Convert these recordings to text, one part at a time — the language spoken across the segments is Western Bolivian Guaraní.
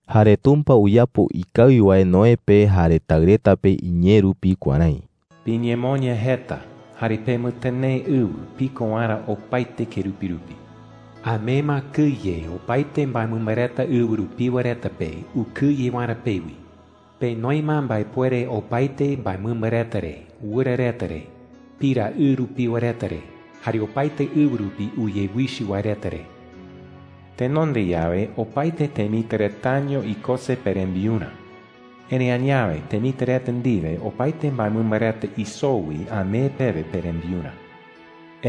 Jare Tumpa uyapo ikawi wae Noé pe jare taɨ reta pe iñee rupi kuärái: “Piñemoña jeta jare pemɨtɨnee ɨwɨ piko waerä opaete kerupi rupi,” jei. “Amee ma kɨye opaete mbaemɨmba reta ɨwɨ rupiwa reta pe ukɨye waerä pewi. Penoi ma mbaepuere opaete mbaemɨmba reta re, wɨra reta re, pira ɨ rupiwa reta re, jare opaete ɨwɨ rupi uyewichɨ wae reta re,” jei chupe reta. “Tenonde yawe, opaete temitɨ retaño ikose perembiurä. Erëi añawe, temitɨ reta ndiwe, opaete mbaemɨmba reta isoo wi amee pewe perembiurä,” jei.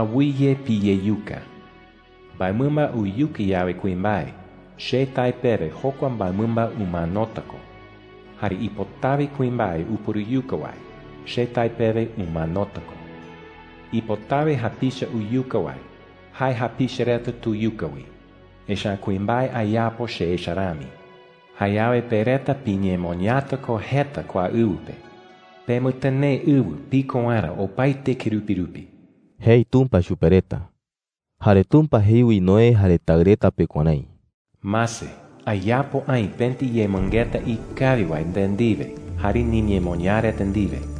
“Awɨye piyeyuka,” jei. “Mbaemɨmba uyuka yawe kuimbae, che tae pewe jokua mbaemɨmba umanota ko. Jare ipotawe kuimbae upuruyuka wae, che tae pewe umanota ko,” jei. “Ipotawe japicha uyuka wae, jae japicha reta tuyuka wi, echa’ä kuimbae ayapo che echa rami,” jei chupe reta. “Jayawe pe reta piñemoñata ko jeta kua ɨwɨ pe. Pemɨtɨnee ɨwɨ piko waerä opaete kerupi rupi,” jei Tumpa chupe reta. Jare Tumpa jei wi Noé jare taɨ reta pe kuärái: “Mase, ayapo aï pëti yemɨngeta ikawi wae nde ndiwe jare niñemoñaa reta ndiwe,” jei.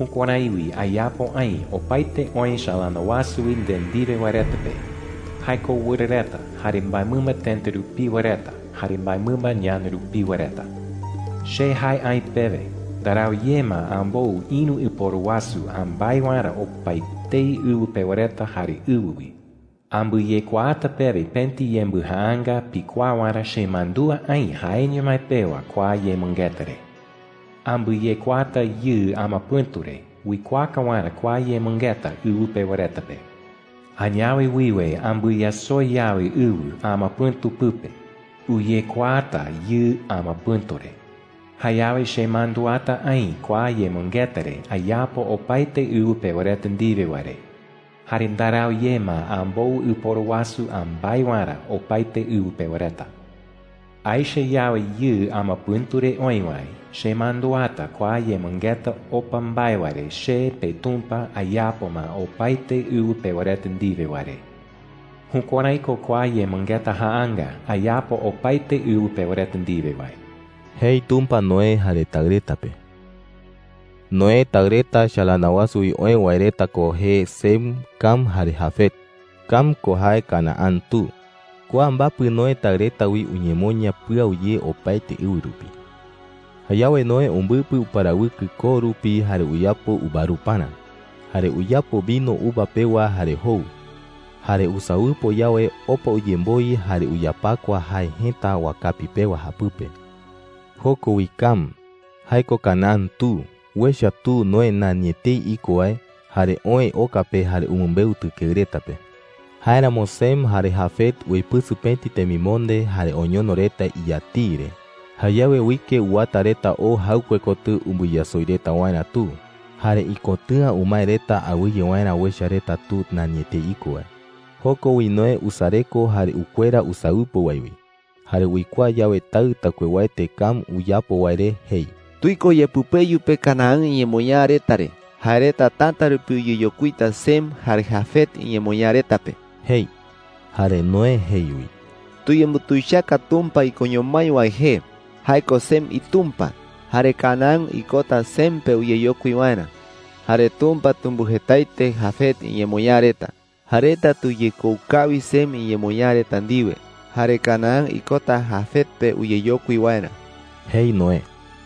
“Jukuärái wi ayapo aï opaete oë chalana wasu wi nde ndiwe wae reta pe – jae ko wɨra reta, jare mbaemɨmba tëta rupiwa reta, jare mbaemɨmba ñana rupiwa reta,” jei. “Che jae aï pewe ndarau ye ma ambou ïru ɨporu wasu ambái waerä opaetei ɨwɨ pewa reta jare ɨwɨ wi,” jei chupe reta. “Ambɨyekuaata pewe pëti yembɨjaanga pikuaa waerä chemandúa aï jaeño mái pewa kua yemɨngeta re,” jei. “Ambɨyekuaata yɨɨ amapɨ̈tu re uikuaaka waerä kua yemɨngeta ɨwɨ pewa reta pe. Añawe wiwe ambɨyasoi yawe ɨwɨ amapɨ̈tu pɨpe, uyekuaata yɨɨ amapɨ̈tu re. Jayawe chemanduata aï kua yemɨngeta re ayapo opaete ɨwɨ pewa reta ndiwe wae re. Jare ndarau ye ma ambou ɨporu wasu ambái waerä opaete ɨwɨ pewa reta,” jei. “Aecha yawe yɨɨ amapɨ̈tu re oï wae, chemanduata kua yemɨngeta opa mbae wae re che, peTumpa, ayapo ma opaete ɨwɨ pewa reta ndiwe wae re,” jei. “Jukuärái ko kua yemɨngeta jaanga ayapo opaete ɨwɨ pewa reta ndiwe wae,” jei Tumpa Noé jare taɨ reta pe. Noé taɨ reta chalana wasu wi oë wae reta ko jee Sem, Cam jare Jafet. Cam ko jae Canaán tu. Kua mbapɨ Noé taɨ reta wi uñemoña pɨau ye opaete ɨwɨ rupi. Jayawe Noé umbɨpɨ uparawɨkɨ koo rupi jare uyapo uvaruparä. Jare uyapo vino uva pewa jare jou. Jare usawɨpo yawe, opa uyemboi jare uyapakua jae jëta wakapi pewa japɨpe. Joko wi Cam – jae ko Canaán tu – uecha tu Noé nani etei iko wae. Jare oë oka pe jare umɨmbeu tɨkeɨ reta pe. Jáeramo Sem jare Jafet uipɨsɨ pëti temimonde jare oñono reta iyatiɨ re. Jayawe uike uwata reta oo jaɨkue kotɨ umbɨyasoi reta waerä tu. Jare ikotɨ̈a umae reta awɨye waerä uecha reta tu nani etei iko wae. Joko wi Noé usareko jare ukuera usawɨpo wae wi. Jare uikuaa yawe taɨ taɨkuewaete Cam uyapo wae re, jei: “¡Tuiko yepɨpeyu pe Canaán iñemoñaa reta re! Jae reta täta rupi uyeyokuita Sem jare Jafet iñemoñaa reta pe,” jei. Jare Noé jei wi: “Tuyembutuichaka Tumpa ikoño mái wae jee. Jae ko Sem iTumpa. Jare Canaán ikota Sem pe uyeyokui waerä,” jei. “Jare Tumpa tumbɨjetaete Jafet iñemoñaa reta. Jae reta tuyekou kawi Sem iñemoñaa reta ndiwe. Jare Canaán ikota Jafet pe uyeyokui waerä,” jei Noé.